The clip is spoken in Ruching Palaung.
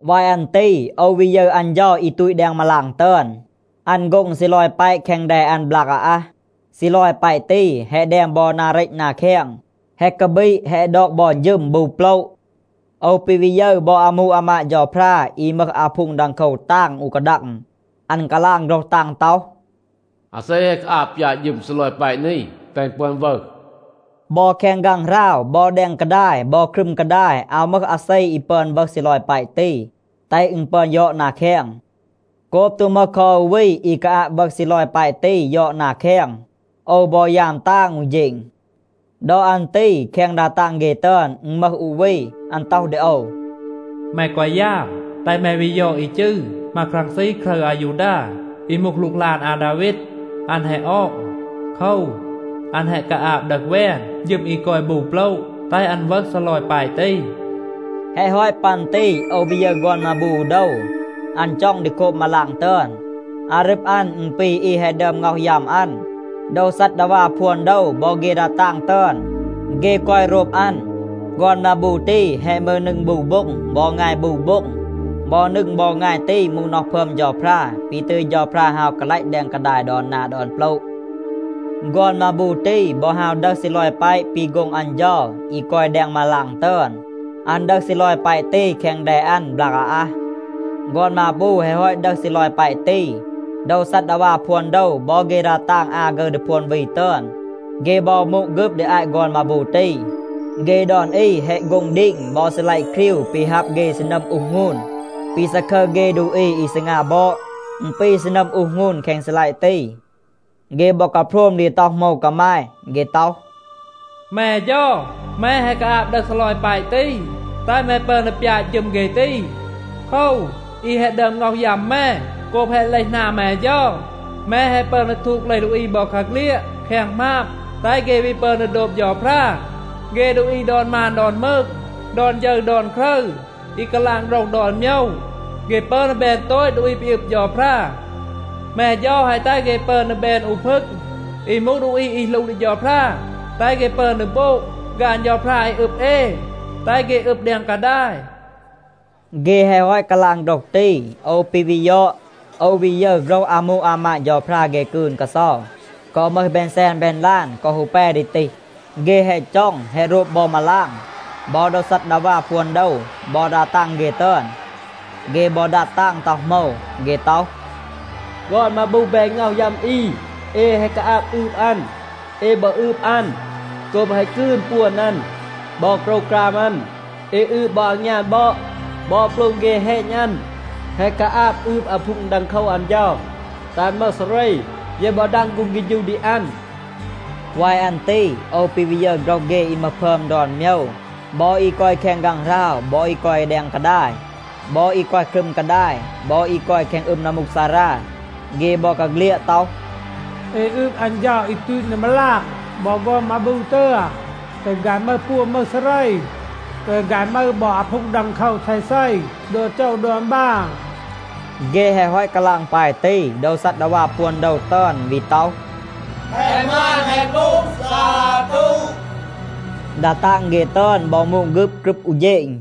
วาย อัน ตี โอว วี ยึร อัน เฌา อี ตูต แดง มาลาง ตึอน. อัน โฆ็ง ซีลอย แปะ แคง แด อัน บลาก อาอัห. ซีลอย แปะ ตี แฮะ แดม บอ นา เรต นา แคง, แฮะ กาบีด, แฮะ ดอก บอ ฌึม บู โปละ. โอว ปี วี ยึร บอ อามู อามาด เฌาพรา อี มึห อาพูง ดังโคว ตาง อู กาดัง. อัน กาลาง โฆรห ตาง ต็อห, “อาเซ แฮะ กาอาบ ปยาต ฌึม ซีลอย แปะ นี, แตห อึณ ปึอน วึห?” บอ แคง ฆางหราว บอ แดง กาดาย บอ ครึม กาดาย, อาว มึห อาเซ อี ปึอน วึห ซีลอย แปะ ตี, แตห อึณ ปึอน ยอด นา แคง. โกบ ตู มึห คอ อู วี อี กาอาบ วึห ซีลอย แปะ ตี ยอด นา แคง, โอว บอ ยาม ตาง อู เฌณ. ดอ อัน ตี แคง ดา ตาง เฆ ตึอน อึณ มึห อู วี, อัน ต็อห ดี โอว, “แม แกวะ ยาม, แตห แม วี ยอด อี จืร ‘มาครังซี ครึร อายูดา’ อี มูห หลูกหลาน อาดาวีด. อัน แฮะ ออง. โคว, อัน แฮะ กาอาบ ดึห แวน ฌึม อี กอย บู โปละ, แตห อัน วึห ซีลอย แปะ ตี.” แฮะ ฮอต ปัน ตี โอว วี ยึร ฆอน มาบู อู โดว. อัน จ็อง ดี โคบ มาลาง ตึอน. อารึบ อัน, อึณ ปี อี แฮะ ดึอม ง็อห ยัม อัน. โดว ซัดดาวา พวน โดว บอ เฆ ดา ตาง ตึอน, เฆ กอย โรบ อัน. ฆอน มาบู ตี แฮะ มึห นึง บู โบ็ง บอ งาย บู โบ็ง. บอ นึง บอ งาย ตี มูห น็อห พึอม เฌาพรา ปี ตึย เฌาพรา ฮาว กาลัต แดง กาดาย ดอน นา ดอน โปละ. ฆอน มาบู ตี บอ ฮาว ดึห ซีลอย แปะ ปี โฆ็ง อัน เฌา อี กอย แดง มาลาง ตึอน. อัน ดึห ซีลอย แปะ ตี แคง แด อัน บลาก อาอัห. ฆอน มาบู แฮะ ฮอต ดึห ซีลอย แปะ ตี, โดว ซัดดาวา พวน โดว บอ เฆ ดา ตาง อา ฆึร ดี พวน วี ตึอน, เฆ บอ มูด ฆึบ ดี อาต ฆอน มาบู ตี. เฆ ดอน อี แฮะ โฆ็ง ดีง บอ ซีลัยะ ครีว ปี ฮับ เฆ ซีนัม อูห หงูน. ปี ซาคึร เฆ ดูอี อี ซีงา บอด, อึณ ปี ซีนัม อูห หงูน แคง ซีลัยะ ตี. เฆ บอ กาโพรม ดี ต็อห โหมว กามาย. เฆ ต็อห, “แม เฌา, แม แฮะ กาอาบ ดึห ซีลอย แปะ ตี, แตห แม ปึอน ดี ปยาต ฌึม เฆ ตี. โคว, อี แฮะ ดึอม ง็อห ยัม แม. โกบ แฮะ เลห หนาม แม เฌา, แม แฮะ ปึอน ดี ทูด เลห ดูอี บอกาเฆลียด แคง หมาบ, แตห เฆ วี ปึอน ดี โดบ เฌาพรา. เฆ ดูอี ดอน มาน ดอน มืง, ดอน ฌึร ดอน ครึร, อี กาลาง โฆรห ดอน โมยว, เฆ ปึอน ดี แบน โตต ดูอี ปี อึบ เฌาพรา. แม เฌา แฮะ แตห เฆ ปึอน ดี แบน อู พึง อี มูห ดูอี อี หลู ดี เฌาพรา. แตห เฆ ปึอน ดี โบง ฆาน เฌาพรา อี อึบ เอ, แตห เฆ อึบ แดง กาดาย.” เฆ แฮะ ฮอต กาลาง โฆรห ตี, โอว ปี วี ยอด, โอว วี ยึร โฆรห อามู อามาด เฌาพรา เฆ กืน กาเซา, กอ มึห แบน แซน แบน ลาน กอ ฮู แป ดี ตีห. เฆ แฮะ จ็อง, แฮะ โรบ บอ มาลาง บอ โดว ซัดดาวา พวน โดว บอ ดา ตาง เฆ ตึอน. เฆ บอ ดัด ตาง ต็อห โหมว. เฆ ต็อห, “ฆอน มาบู แปะ แฮะ ง็อห ยัม อี, เอ แฮะ กาอาบ อืบ อัน. เอ บอ อืบ อัน โกบ แฮะ กืน ปวน อัน บอ โกรวกราม อัน. เอ อืบ บอ อางยาน บอด บอ โปลม เฆ แฮณ อัน. แฮะ กาอาบ อืบ อาพูง ดังโคว อัน เฌา, แตห อัน มึห ซาเร. เย บอ ดาง ฆูง เฆฌู ดี อัน.” วาย อัน ตี โอว ปี วี ยึร โฆรห เฆ อี มึห พึอม ดอน โมยว. บอ อี กอย แคง ฆางหราว บอ อี กอย แดง กาดาย, บอ อี กอย ครึม กาดาย บอ อี กอย แคง อึม นัมมูกซารา, เฆ บอกาเฆลียด ต็อห, “เอ อืบ อัน เฌา อี ตูต แดง มาลาง บอ ฆอน มาบู ตึอน, แตห ฆาย มึห ปวน, มึห ซาเร. แตห ฆาย มึห บอ อาพูง ดังโคว เซเซ ดอน โจว ดอน บาน.” เฆ แฮะ ฮอต กาลาง ปาย ตี, โดว ซัดดาวา พวน โดว ตึอน วี ต็อห, “แฮะ หมาน, แฮะ มูห, ซาตู.” ดา ตาง เฆ ตึอน บอ มูด ฆึบ กรึบ อู เฌณ.